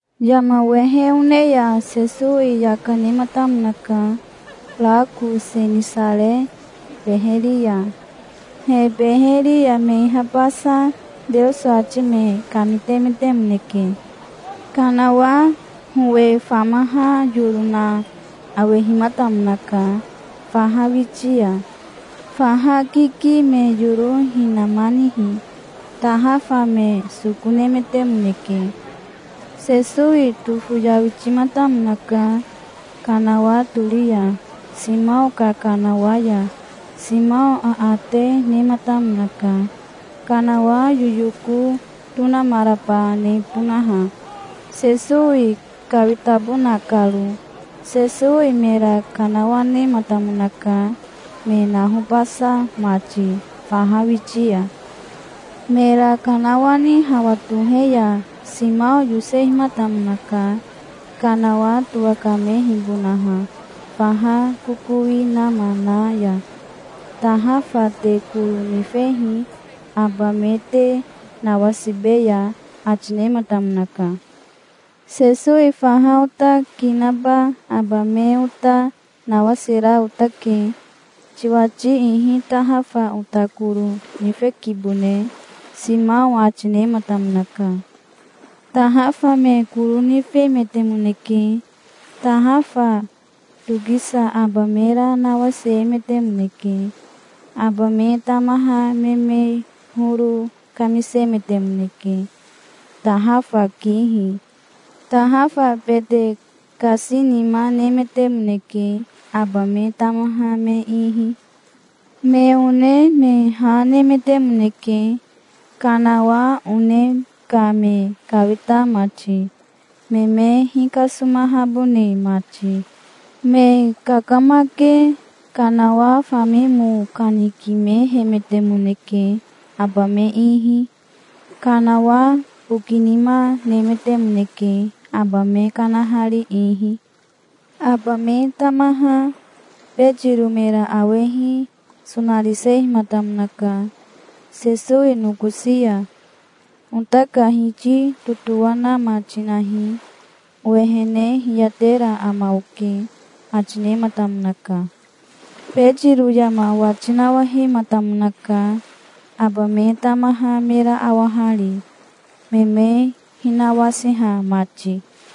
Yama wehe one ya Sesowi yaka nematamonaka rako Senisare beheri ya. He beheri ya me ihabasa Teoso ati me kamitemetemoneke. Kanawa howe famaha yoro na awehimatamonaka faha witi ya. Faha kiki me yoro hinamanihi tahafa me soko nemetemoneke. Sesowi tofoyawitimatamonaka kanawa tori ya, Simao ka kanawa ya. Simao aate nematamonaka, kanawa yoyoko tonamaraba nebonaha, Sesowi kawitabona karo. Sesowi mera kanawanematamonaka, me nahobasa mati faha witi ya. Mera kanawani hawa tohe ya Simao yosehimatamonaka, kanawa towakamehibonaha faha kokowi nama na ya. "Tahafa te koro nifehi, aba me te nawasibeya", ati nematamonaka. "Sesowi faha ota ki naba aba me ota nawasira otake. Tiwati ihi tahafa ota koro nifekibone", Simao ati nematamonaka. Tahafa me koro nifemetemoneke. Tahafa tokisa aba mera nawasiemetemoneke. Aba me tamaha me me horo kamisemetemoneke, tahafa kihi. Tahafa bete kasinima nemetemoneke, aba me tamaha me ihi. Me one me ha nemetemoneke, kanawa one ka me kawita mati, me me hikasomahabone mati. Me kakamake kanawa fami mo kanikimehemetemoneke aba me ihi. Kanawa bokinima nemetemoneke aba me kanahari ihi. Aba me tamaha Betiro mera awehi sonarisehimatamonaka Sesowi nokosi ya. "Ota ka Hiti totowanama tinahi. Owehene hiyatera ama oke", ati nematamonaka. Betiro yama wati nawahematamonaka, aba me tamaha mera awahari, me me hinawasiha mati.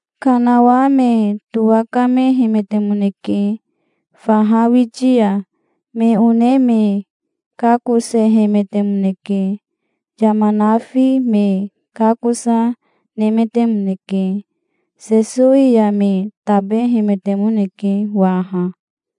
Kanawa me towakamehemetemoneke faha witi ya. Me one me kakosehemetemoneke. Yama nafi me kakosa, nemetemoneke. Sesowi ya me tabehemetemoneke waha.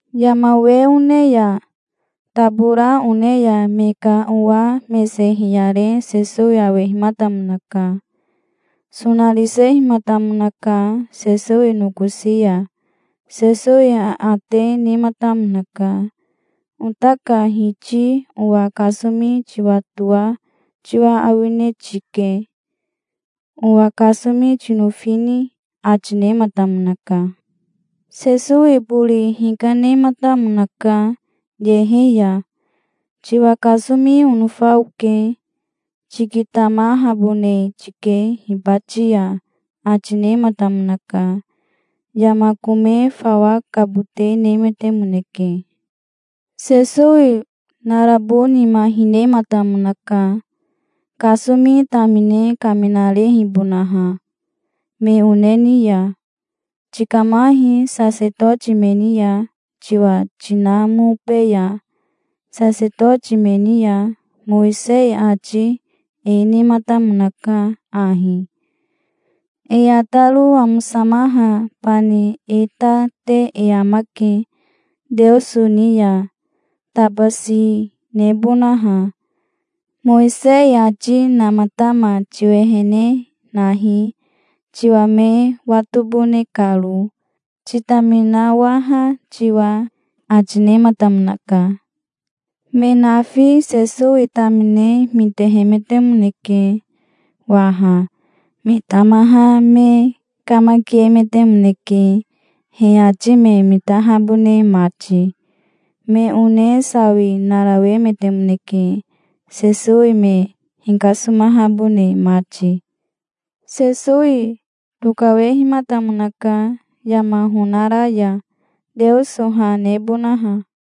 Yama we one ya tabora one ya me ka owa mese hiyare Sesowi awehimatamonaka. Sonarisehimatamonaka Sesowi nokosi ya. Sesowi aate nematamonaka. "Ota ka Hiti owa kasomi tiwatoa tiwa awine tike. Owa kasomi tinofini?" ati nematamonaka. Sesowi bori hikanematamonaka yehe ya. "Tiwa kasomi onofa oke. Tikitamahabone tike hibati ya", ati nematamonaka. Yama kome fawa kabote nemetemoneke. Sesowi narabo nima hinehimatamonaka, kasomi tamine kaminarehibonaha me one ni ya. "Tikamahi sasetoti me ni ya, tiwa tinamobeya sasetoti me ni ya. Mowisei ati e nematamonaka ahi: E ataro amosamaha bani e ta te e amake Teoso ni ya, tabasi nebonaha. Mowisei ati namatama tiwehene nahi, tiwa me watobone karo, titaminawaha tiwa", ati nematamonaka. Me nafi Sesowi tamine mitehemetemoneke waha. Me tamaha me kamakiemetemoneke he ati me mitahabone mati. Me one sawi narawemetemoneke Sesowi me hikasomahabone mati. Sesowi tokawehimatamonaka yama honara ya, Teoso ha nebonaha.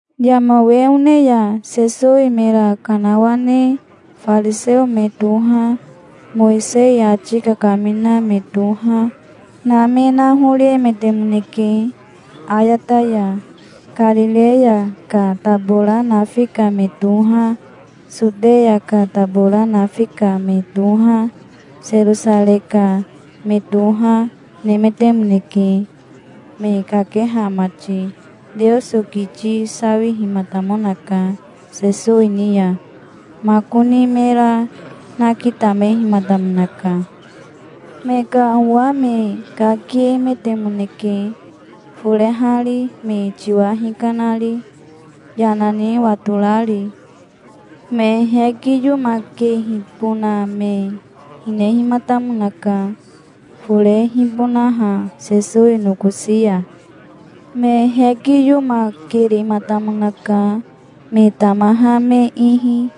Yama we one ya Sesowi mera kanawane fariseo me toha, Mowisei ati kakamina me toha, na me nahoriemetemoneke ayata ya. Karireya ka tabora nafi ka me toha, Soteya ka tabora nafi ka me toha, Serosarei ka me toha, nemetemoneke, me kakeha mati. Teoso kiti sawihimatamonaka Sesowi ni ya, makoni mera nakitamehimatamonaka. Me ka owa me kakiemetemoneke forehari, me tiwa hikanari, yana ni watorari. Me hekiyomakehibona me hinehimatamonaka, forehibonaha Sesowi nokosi ya. Me hekiyomakerematamonaka, me tamaha me ihi.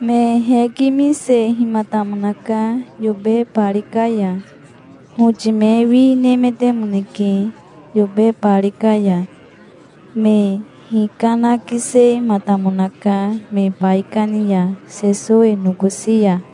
Me hekimisehimatamonaka yobe bari ka ya. Hoti me wi nemetemoneke yobe bari ka ya. Me hikanakisematamonaka me baikani ya Sesowi nokosi ya.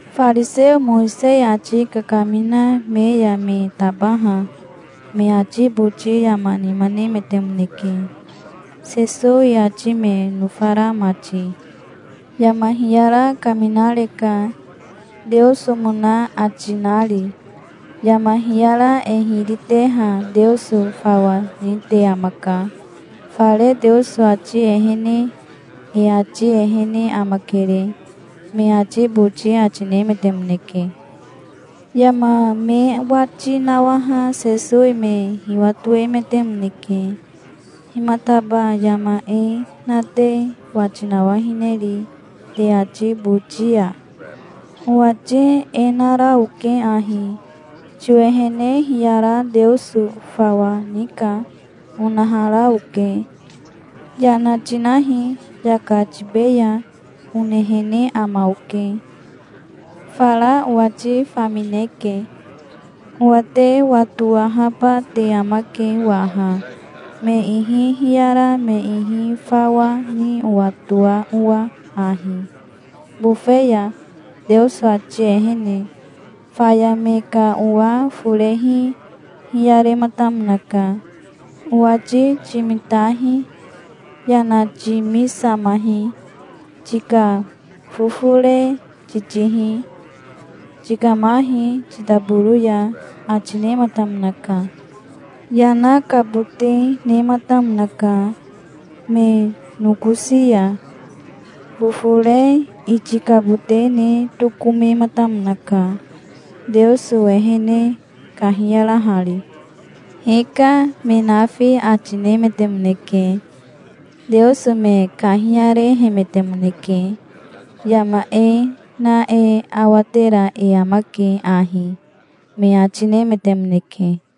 Fariseo Mowisei ati kakamina me ya me tabaha me ati boti yama nima nemetemoneke, Sesowi ati me nofara mati. "Yama hiyara kaminareka, Teosomona ati nari. Yama hiyara e hiri teha Teoso fawa nite amaka, fare Teoso ati ehene. E ati ehene amakere", me ati boti ati nemetemoneke. Yama me wati nawaha Sesowi me hiwatoemetemoneke. "Himataba yama e na te wati nawahineri te ati boti ya? Owati e nara oke ahi: 'Tiwehene hiyara Teoso fawa nika', onahara oke. 'Yana tinahi, yaka tibeya', onehene ama oke. Fara owati famineke. Owa te watowahaba te amake waha, me ihi hiyara me ihi fawa ni owatoa owa ahi, bofe ya, Teoso ati ehene". Faya me ka owa forehi hiyarematamonaka. "Owati timitahi. Yana timisamahi. Tika fofore titihi. Tikamahi titaboro ya", ati nematamonaka. Yana kabote nematamonaka me nokosi ya. Fofore itikabote ne tokomematamonaka, Teoso ehene kahiyarahari. "Hika", me nafi ati nemetemoneke. Teoso me kahiyarehemetemoneke. "Yama e na e awatera e amake ahi", me ati nemetemoneke.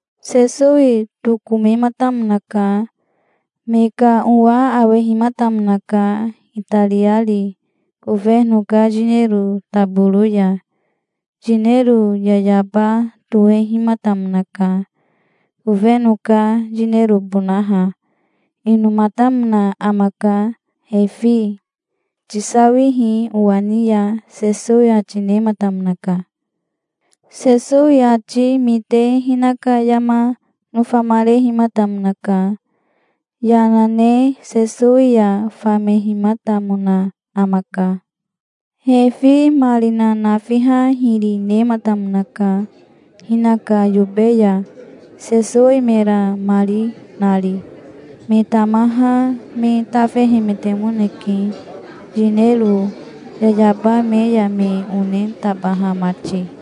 Sesowi tokomematamonaka. Me ka owa awehimatamonaka itariari kofeno ka yinero taboro ya. Yinero yayaba tohehimatamonaka, kofeno ka yinerobonaha. Inomatamona amaka Refi. "Tisawihi owa ni ya", Sesowi ati nematamonaka. Sesowi ati mite hinaka yama nofamarehimatamonaka. Yana ne Sesowi ya famehimatamona amaka. Refi marina nafiha hiri nematamonaka hinaka yobe ya, Sesowi mera mari nari. Me tamaha me tafehemetemoneke, yinero yayaba me ya me one tabaha mati.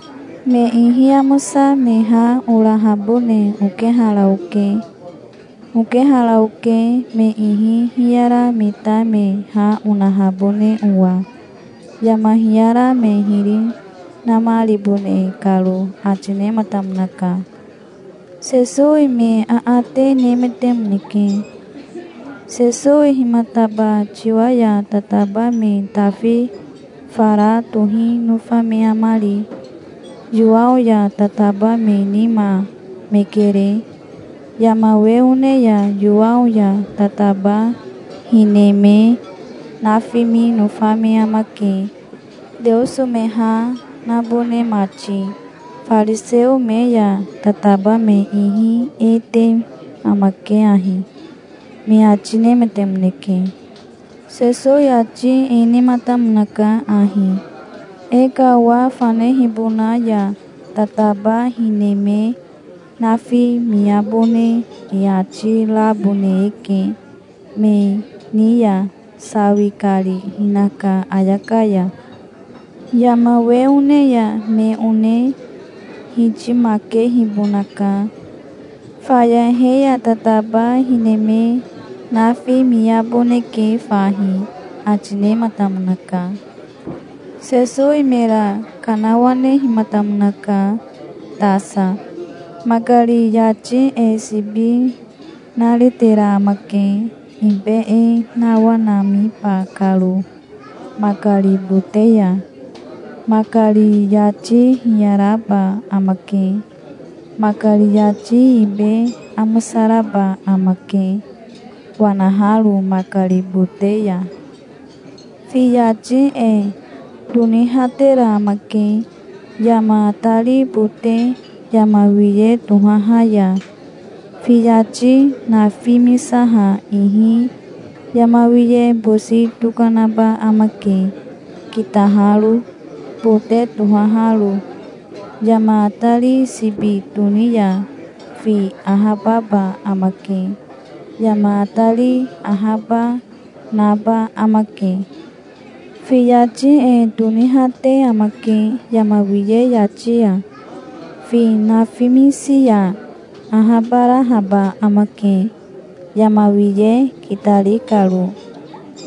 Me ihi amosa me ha orahabone okehara oke. Okehara oke, me ihi hiyara me ta me ha onahabone owa, yama hiyara me hiri namaribone karo", ati nematamonaka. Sesowi me aate nemetemoneke. "Sesowi himataba tiwa ya tataba me tafi fara tohi nofa me amari? Yowao ya tataba me nima me kere. Yama we one ya Yowao ya tataba hine me nafimi nofa me amake, Teoso me ha nabone mati. Fariseo me ya tataba me ihi e, te amake ahi", me ati nemetemoneke. Sesowi ati e nematamonaka ahi: "E ka owa fanehibona ya tataba hine me nafimiabone e ati rabone eke, me ni ya sawi kari hinaka ayaka ya. Yama we one ya me one hitimakehibonaka. Faya he ya tataba hine me nafimiaboneke fahi", ati nematamonaka. Sesowi mera kanawanehimatamonaka tasa. "Makari yati e sibi naretera amake, ibe e nawanamiba karo makari bote ya. Makari yati hiyaraba amake. Makari yati ibe amosaraba amake wanaharo makari bote ya. Fi yati e tonihatera amake yama atari bote yama wiye tohaha ya. Fi yati nafimisaha ihi yama wiye bosi tokanaba amake, kitaharo, bote tohaharo. Yama atari sibi toni ya fi ahababa amake. Yama atari ahaba, naba amake. Fi yati e tonihate amake yama wiye yati ya. Fi nafimisi ya ahabarahaba amake, yama wiye kitari karo,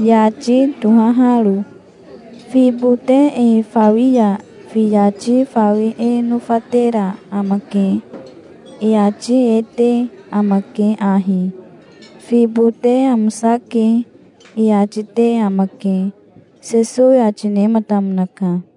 yati tohaharo. Fi bote e fawi ya fi yati fawi e nofatera amake. E ati e te amake ahi: 'Fi bote amosake', e ati te amake", Sesowi ati nematamonaka.